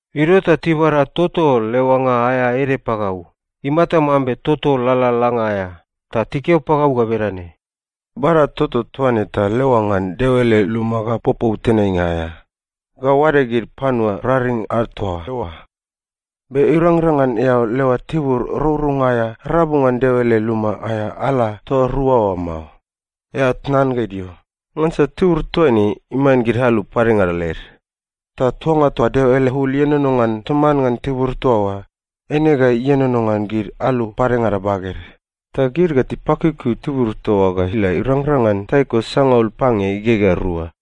Idio ta tibada toto leoanga aea ede pagau, imata mambe toto lalalanga aea, ta tikeo pagau ga bedane, “Bada toto toa ne ta leoa ngan Deo ele luma ga popou tenainga aea, ga oade gid panua raring ad toa eoa. Be irangrang ngan eao leoa tibur rourounga aea rabu ngan Deo ele luma aea ala toa rua oa mao. Eao tnan ga idio, ngansa tibur toaine iman gid alu padengada led. Ta tuanga toa Deo ele ul ienono ngan toman ngan tibur toa oa, eine ga ienono ngan gid alu padengada baged, ta gid ga tipakiukiu tibur toa oa ga ila irangrang ngan taiko sangaul pange igegea rua.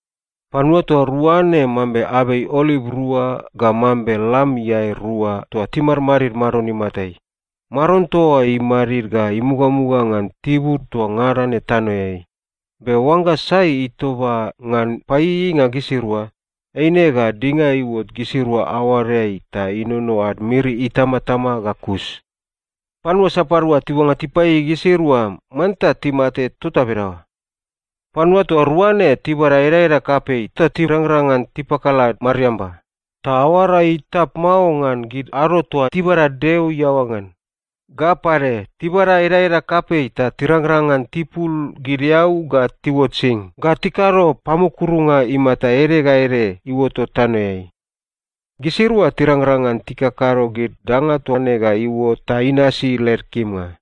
Panua toa rua ne mambe abei oliv rua ga mambe lam iae rua toa timadmadid Maron imatai. Maron toa oa imadid ga imugamuga ngan tibur toa ngada ne tanoeai. Be oangga sai itoba ngan paieieinga gisirua, eine ga dinga iuot gisirua aoadeai ta inono ad miri itamatama ga kus. Panua sapadua tiuangga tipaieiei gisirua, manta timate tota bedaoa. Panua toa rua ne tibada edaeda kapei ta tirangrang ngan tipakala mariamba, ta aoara ga itap mao ngan gid ado toa tibada Deo iaoa ngan. Ga pade, tibada edaeda kapei ta tirangrang ngan tipul gid eau ga tiuot sing ga tikado pamukurunga imata ede ga ede iuotot tanoeai. Gisirua tirangrang ngan tikakado gid danga toa ne ga iuot ta inasi led kimnga.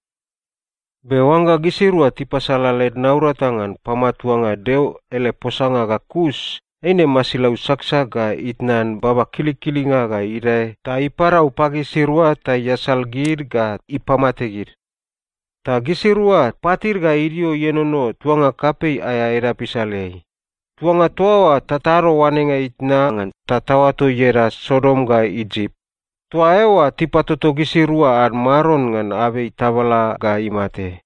Be oangga gisirua tipasala led naurata ngan pamatuanga Deo ele posanga ga kus, eine masilau saksak ga itnan baba kilikilinga ga idae ta iparau pagisirua ta iasal gid ga ipamate gid. Ta gisirua patid ga idio ienono tuanga kapei aea edap isaleai. Tuanga toa oa tatado oanenga itna ngan ta taoato ieda Sodom ga Isip. Toa eoa tipatoto gisirua ad Maron ngan abei tabala ga imate.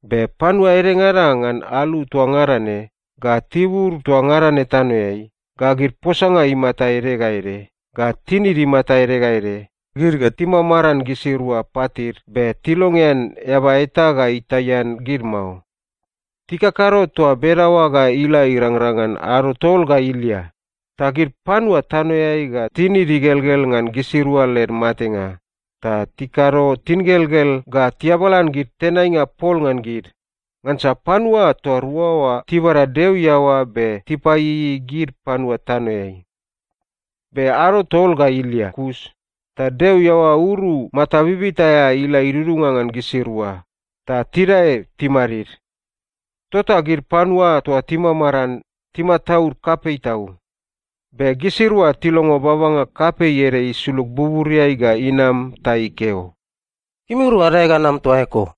Be panua edengada ngan alu toa ngada ne, ga tibur toa ngada ne tanoeai, ga gid posanga imata ede ga ede, ga tinid imata ede ga ede, gid ga timamaran gisirua patid be tilongean eaba eta ga itaian gid mao. Tikakado toa bedaoa ga ila irangrang ngan ado tol ga ilia. Ta gid panua tanoeai ga tinid igelgel ngan gisirua led matenga, ta tikado tingelgel ga tiabalan gid tenainga pol ngan gid. Ngansa panua toa rua oa tibada Deo iaoa be tipaieiei gid panua tanoeai. Be ado tol ga ilia kus, ta Deo iaoa uru mata bibita aea ila idudunga ngan gisirua, ta tidae timadid. Tota gid panua toa timamaran, timataud kapei tau. Be gisirua tilongo babanga kapei ede isulug buburiai ga inam ta ikeo, “Gimirua adae ga anam toa eko!”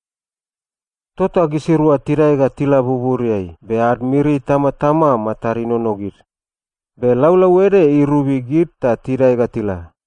Tota gisirua tidae ga tila buburiai, be ad miri itamatama matad inono gid. Be laulau ede irobi gid ta tidae ga tila.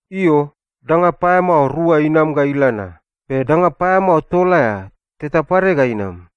Io, danga paeamao rua inam ga ila na. Be danga paeamao tol aea, teta pade ga inam.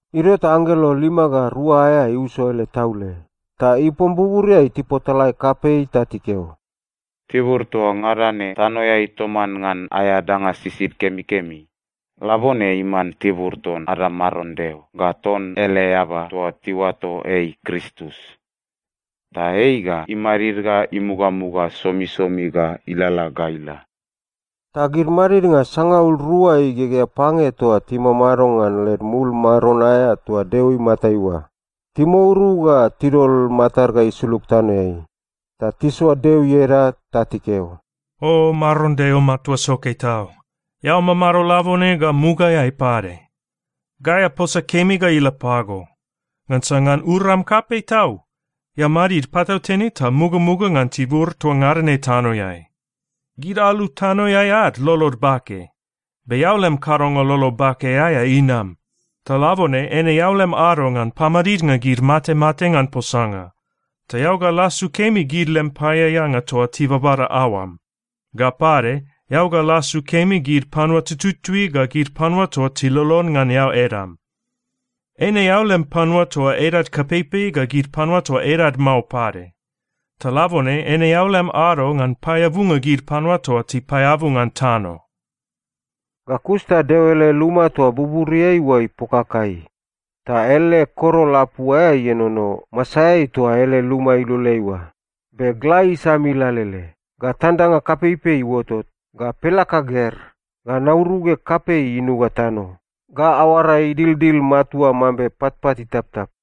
Idio ta anggelo lima ga rua aea iuso ele taule. Ta ipom buburiai tipotalae kapei ta tikeo, “Tibur toa ngada ne tanoeai toman ngan aea danga sisid kemikemi, labone iman tibur ton ada Maron Deo ga ton ele eaba toa tiuato ei Kristus. Ta ei ga imadid ga imugamuga somisomi ga ilalala ga ila.” Ta gid madidnga sangaul rua igegea pange toa timamado ngan led mul maron aea toa Deo imatai oa, timouru ta tidol matad ga isulug tanoeai. Ta tisoa Deo ieda ta tikeo, “O Maron Deo Matua Soke Tau, eao mamado labone ga mugaeai pade. Gai aposa kemi ga ila pago, ngansa ngan uram kapei tau eao madid patautene ta mugamuga ngan tibur toa ngada ne tanoeai. Gid alu tanoeai ad lolod bake, be eao lem kadonga lolo bake aea inam. Ta labone eine eao lem ado ngan pamadidnga gid matemate ngan posanga. Ta eao ga lasu kemi gid lem paeaeanga toa tibabada aoam. Ga pade, eao ga lasu kemi gid panua tututui ga gid panua toa tilolon ngan eao edam. Eine eao lem panua toa edad kapeipei ga gid panua toa edad mao pade. Ta labone eine eao lem ado ngan paeabunga gid panua toa tipaeabu ngan tano.” Ga kus ta Deo ele luma toa buburiai oa ipokakai. Ta ele korol apu aea ienono masaeai toa ele luma iloleai oa. Be gla isamil alele, ga tandanga kapeipei iuotot, ga pelaka ger, ga nauruge kapei inuga tano, ga aoara idildil matua mambe patpat itaptap.